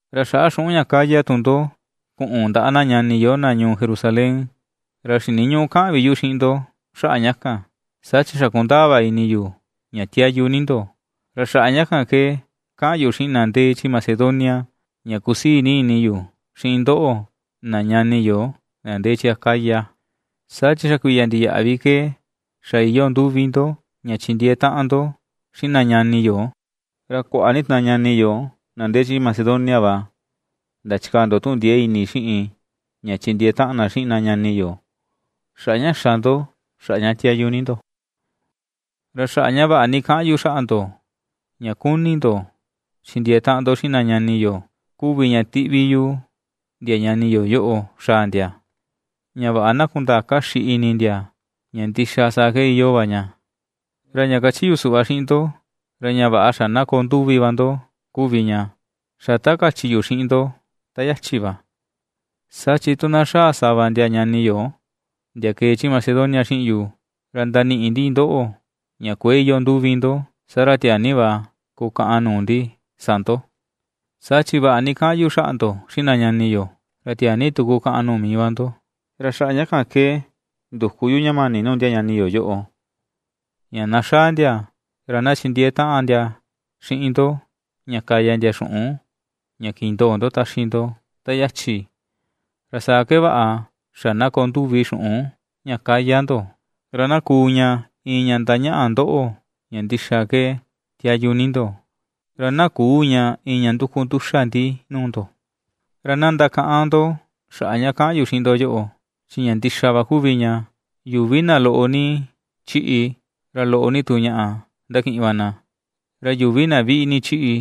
Ra xaꞌa xuꞌun ña ^kaya tu ndo kuꞌun ndaꞌa na ñani yo na ñuu Jerusalén, ra xiniñüꞌu kaꞌan vi yu xiꞌin ndo xaꞌa ña kan. Saa chi xa kundaa va ini yu ña tiayu ni ndo. Ra xaꞌa ña kan ke kaꞌan yu xiꞌin na ndee chi Macedonia ña kusii ni ini yu xiꞌin ndoꞌo na ñani yo na ndee chi Acaya, saa chi xa kuiya ndiyaꞌa vi ke xa iyoo nduvi ndo ña chindiee taꞌan ndo xiꞌin na ñani yo; ra kuaꞌa ni tu na ñani yo na ndee chi Macedonia va ndachikaa ndo tuꞌun ndiee ini xiꞌin ña chindiee taꞌan na xiꞌin na ñani yo xaꞌa ña xa ndo, xaꞌa ña tiayu ni ndo. Ra xaꞌa ña vaꞌa ni kaꞌan yu xaꞌa ndo ña kuni ndo chindiee taꞌan ndo xiꞌin na ñani yo kuvi ña ^tiꞌvi yu ndia ñani yo yoꞌo xaa ndia, ña vaꞌa na kundaa kaxi ini ndia ña ndixa saa ke iyoo va ña. Ra ña kachi yu suꞌva xiꞌin ndo, ra ña vaꞌa xa na koo nduvi va ndo kuvi ña, xa ta kachi yu xiꞌin ndo ta yachi va. Saa chi tu na xaa sava ndia ñani yo ndia kee chi Macedonia xiꞌin yu, ra ndaniꞌi ndi ndoꞌo ña kuëe iyoo nduvi ndo. Saa ra tiaa ni va kukaꞌan nuu ndi sa ndo, saa chi vaꞌa ni kaꞌan yu xaꞌa ndo xiꞌin na ñani yo, ra tiaa ni tu kukaꞌan nuu mii va ndo. Ra xaꞌa ña kan ke nduku yu ña mani nuu ndia ñani yo yoꞌo, ña na xaa ndia, ra na chindiee taꞌan ndia xiꞌin ndo ña kaya ndia xuꞌun ña kindoo ndo taxi ndo ta yachi. Ra saa ke vaꞌa xa na koo nduvi xuꞌun ña ^kaya ndo, ra na kuu ña iin ña ndañaꞌa ndoꞌo ña ndixa ke tiayu ni ndo, ra na küu ña iin ña nduku nduxa ndi nuu ndo. Ra na ndakaꞌan ndo xaꞌa ña kaꞌan yu xiꞌin ndo yoꞌo, chi ña ndixa va kuvi ña: Yuvi na loꞌo ni ^chiꞌi, ra loꞌo ni tu ñaꞌa ^ndakiꞌin va na; ra yuvi na viꞌi ni ^chiꞌi,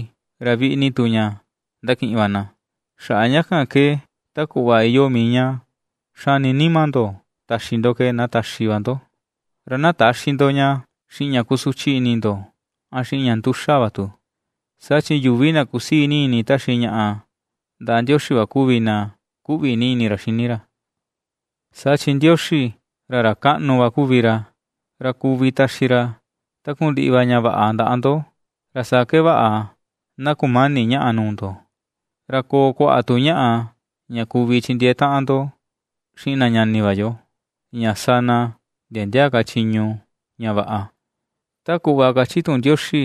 ra viꞌi ni tu ñaꞌa ^ndakiꞌin va na. Xaꞌa ña kan ke ta kuꞌva iyoo mii ña xani nima ndo taxi ndo ke na taxi va ndo; ra na täxi ndo ña xiꞌin ña kusuchi ini ndo, a xiꞌin ña nduxa va tu, saa chi yuvi na kusii ni ini taxi ñaꞌa ndaꞌa Ndioxi va kuvi na kuꞌvi ni ini ra xini ra. Saa chi Ndioxi, ra ra kaꞌnu va kuvi ra, ra kuvi taxi ra takundiꞌi va ña vaꞌa ndaꞌa ndo, ra saa ke vaꞌa na kumäni ñaꞌa nuu ndo, ra koo kuaꞌa tu ñaꞌa ña kuvi chindiee taꞌan ndo xiꞌin na ñani va yo, ña sa na ndia ndia ka chiñu, ña vaꞌa. Ta kuꞌva kachi tuꞌun Ndioxi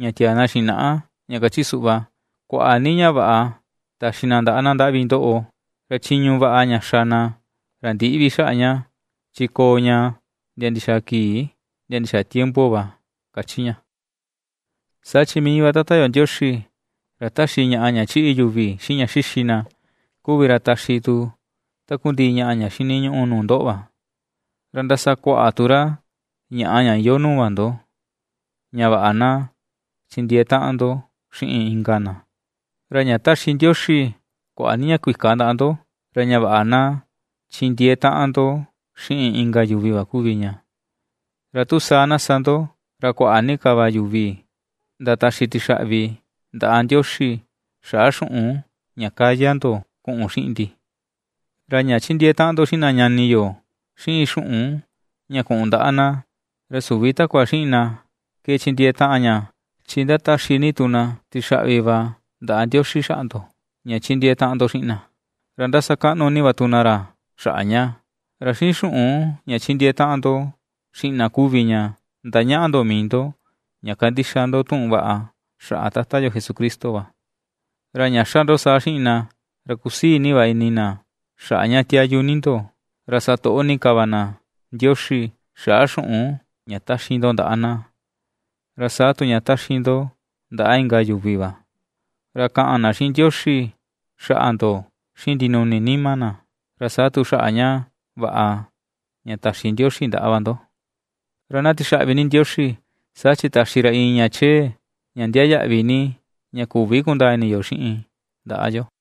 ña tiaa na xinaꞌa ña kachi suꞌva: Kuaꞌa ni ña vaꞌa taxi na ndaꞌa na ^ndaꞌvi ndoꞌo, ra chiñu vaꞌa ña xa na, ra ndïꞌi vi xaꞌa ña, chi koo ña ndia ndixaa kii ndia ndixaa tiempo va, ^kachi ña. Saa chi mii va Tata yo Ndioxi, ra ^taxi ñaꞌa ña chiꞌi yuvi, xiꞌin ña xixi na, kuvi ra taxi tu takundiꞌi ñaꞌa ña xiniñuꞌu nuu ndoꞌo va, ra ndasakuaꞌa tu ra ñaꞌa ña iyoo nuu va ndo, ña vaꞌa na chindiee taꞌan ndo xiꞌin inka na. Ra ña ^taxi Ndioxi kuaꞌa ni ña kuika ndaꞌa ndo, ra ña vaꞌa na chindiee taꞌan ndo xiꞌin inka yuvi va kuvi ña. Ra tu saa na sa ndo, ra kuaꞌa ni ka va yuvi ndataxi tixaꞌvi ndaꞌa Ndioxi xaꞌa xuꞌun ña kaya ndo kuꞌun xiꞌin ndi. Ra ña ^chindiee taꞌan ndo xiꞌin na ñani yo xiꞌin xuꞌun ña kuꞌun ndaꞌa na, ra süvi takua xiꞌin na ke chindiee taꞌan ña, chi ndataxi ni tu na tixaꞌvi va ndaꞌa Ndioxi xaꞌa ndo, ña ^chindiee taꞌan ndo xiꞌin na. Ra ndasakaꞌnu ni va tu na ra xaꞌa ña, ra xiꞌin xuꞌun ña ^chindiee taꞌan ndo xiꞌin na kuvi ña ^ndañaꞌa ndo mii ndo ña kandixa ndo tuꞌun vaꞌa xaꞌa Tata yo Jesucristo va. Ra ña ^xa ndo saa xiꞌin na, ra ^kusii ni va ini na xaꞌa ña tiayu ni ndo, ra sa toꞌo ni ka va na Ndioxi xaꞌa xuꞌun ña taxi ndo ndaꞌa na, ra saa tu ña taxi ndo ndaꞌa inka yuvi va. Ra kaꞌan na xiꞌin Ndioxi xaꞌa ndo xiꞌin ndinuni nima na, ra saa tu xaꞌa ña vaꞌa ña taxi Ndioxi ndaꞌa va ndo. ¡Ra na tixaꞌvi ni Ndioxi, saa chi taxi ra iin ña chee, ña ndiaa yaꞌvi ni, ña küvi kundaa ini yo xiꞌin ndaꞌa yo!